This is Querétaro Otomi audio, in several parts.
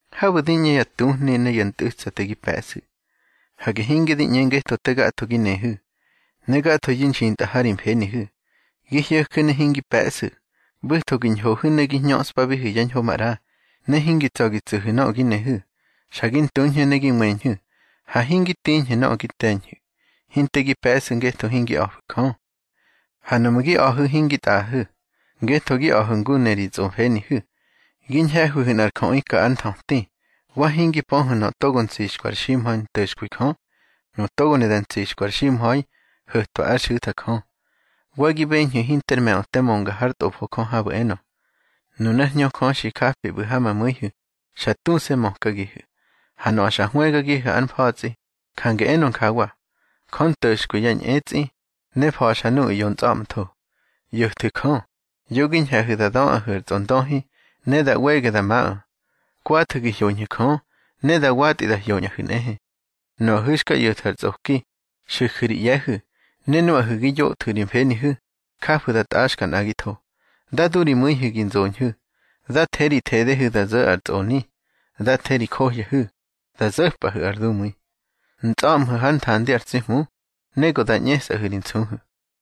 Habu̱ di ꞌñe ya tuhni ne ya ntꞌu̱tsate gi pe̱ꞌsu̱. Hage hinge di ꞌñe ngetho te gatho gi nehu̱, ne gathoyu̱ nxintꞌa ha ri mfenihu̱. Gi hyo̱ju̱ ne hingi pe̱ꞌsu̱. ꞌBu̱tho gi ñhohu̱ ne gi ñöꞌspabihu̱ yá ñho maꞌra, ne hingi tsa̱ gi tsu̱hu̱ nöꞌö gi nehu̱. Xa gi ntuñhu̱ ne gi weñhu̱, ha hingi tiñhu̱ nöꞌö gi te̱ñhu̱. Hinte gi pe̱ꞌsu̱ ngetho hingi a̱fu̱ Jö. Ha nuꞌmu̱ gi a̱hu̱ hingi tꞌaꞌahu̱, ngetho gi a̱hu̱ ngu ne ri tsꞌomfenihu̱. Gi ñhe̱hwihu̱ nꞌar jöꞌi ka ár nthöti. Wa hingi pöhu̱ nöꞌö togo ntsixkwi ar ximha̱i nto̱xkwi Jö. Nu togo ne da ntsixkwi ar ximha̱i, ho̱twa ár xu̱tha Jö. Wa gi beñhu̱ hinter me̱ꞌö te mönga hár Tꞌofo Jö habu̱ enö: Nunár Hñö Jö xi japi ꞌbu̱ ha ma mu̱ihu̱, xa tuse̱ mökagihu̱. Ha nöꞌö xa hwëgagihu̱ ár mfa̱tsꞌi, jange enö njawa: Jö nto̱xkwi ya ñꞌetsꞌi, ne fa̱xa nuꞌu̱ ꞌyo ntsꞌa̱ꞌmtho. ꞌYo̱thwu̱ Jö, yo gi ñhe̱hu̱ da döꞌahu̱ ar tsꞌondöhi, ne da ꞌwege da maꞌö. Kwathu̱ gi hyoñhu̱ Jö, ne da watꞌi da hyoñꞌahu̱ nꞌehe. Nuꞌahu̱ xka ꞌyo̱thu̱ ar tsꞌoki, xu̱ju̱ ri ꞌye̱hu̱. Ne nuꞌahu̱ gi yótꞌa ri mfenihu̱, jafu̱ da tꞌaxka nꞌagitho. Dá du ri mu̱ihu̱ gi nzoñhu̱. Dá the ri thedehu̱ da zo̱ ar tsꞌoni. Dá the ri johyahu̱, da zo̱pꞌahu̱ ar dumu̱i. Ntsꞌa̱ꞌmhu̱ hár nthandi ar tsi Hmu, ne go da ꞌñesꞌahu̱ ri nsuhu̱.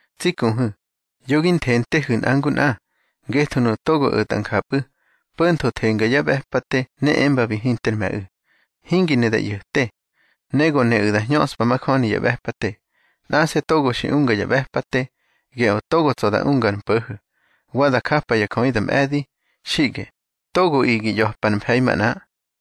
Tsi kuhu̱, yo gi nthentehu̱ nꞌa ngu nꞌa. Ngetho nuꞌu̱ togo o̱tꞌa njapꞌu̱, po̱ntho thenga ya ꞌbe̱pate ne embabi hinter me̱ꞌu̱. Hingi ne da ꞌyo̱te, ne go neꞌu̱ da hñöꞌspa majöni ya ꞌbe̱pate. Nꞌase̱ togo xi unga ya ꞌbe̱pate, geꞌö togo tsa̱ da unga ar mpo̱ho̱, wa da japa ya jöꞌi da mꞌe̱di. Xiꞌge, togoꞌi gi ꞌya̱pa ár mfe̱i manꞌa.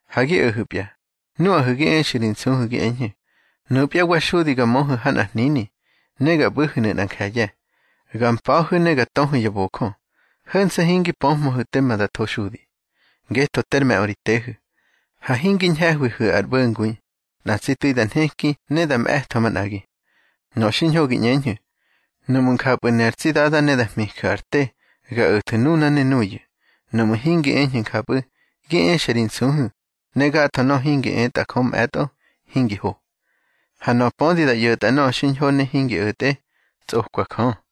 Ha gi o̱hu̱pya, nuꞌahu̱ gi exu̱ ri nsuhu̱ gi eñhu̱: Nupya wa xudi ga möhu̱ ha nꞌar hnini, ne ga ꞌbu̱hu̱nu̱ nꞌa nje̱ye̱, ga mpa̱hu̱ ne ga töhu̱ ya bojö. Ho̱nse̱ hingi pöhmöhu̱ tema da tho xudi. Ngetho ter me̱ꞌö ri tehu̱. Ha hingi ñhe̱hwihu̱ ar ꞌbo̱ngui, nꞌa tsi tu̱i da nheki ne da mꞌe̱tho manꞌagi. Nöꞌö xiñho gi ꞌñeñhu̱: Nuꞌmu̱ njapꞌu̱ ne ar tsi Dada ne da hmiju̱ ar te, ga o̱thu̱ nuna ne nuyu̱. Nuꞌmu̱ hingi eñhu̱ njapꞌu̱, gi exa ri nsuhu̱, ne gatho nöꞌö hingi etꞌa Jö mꞌe̱tꞌo, hingi ho. Ha nöꞌö pödi da ꞌyo̱tꞌa nöꞌö xiñho ne hingi o̱tꞌe, tsꞌokwa Jö.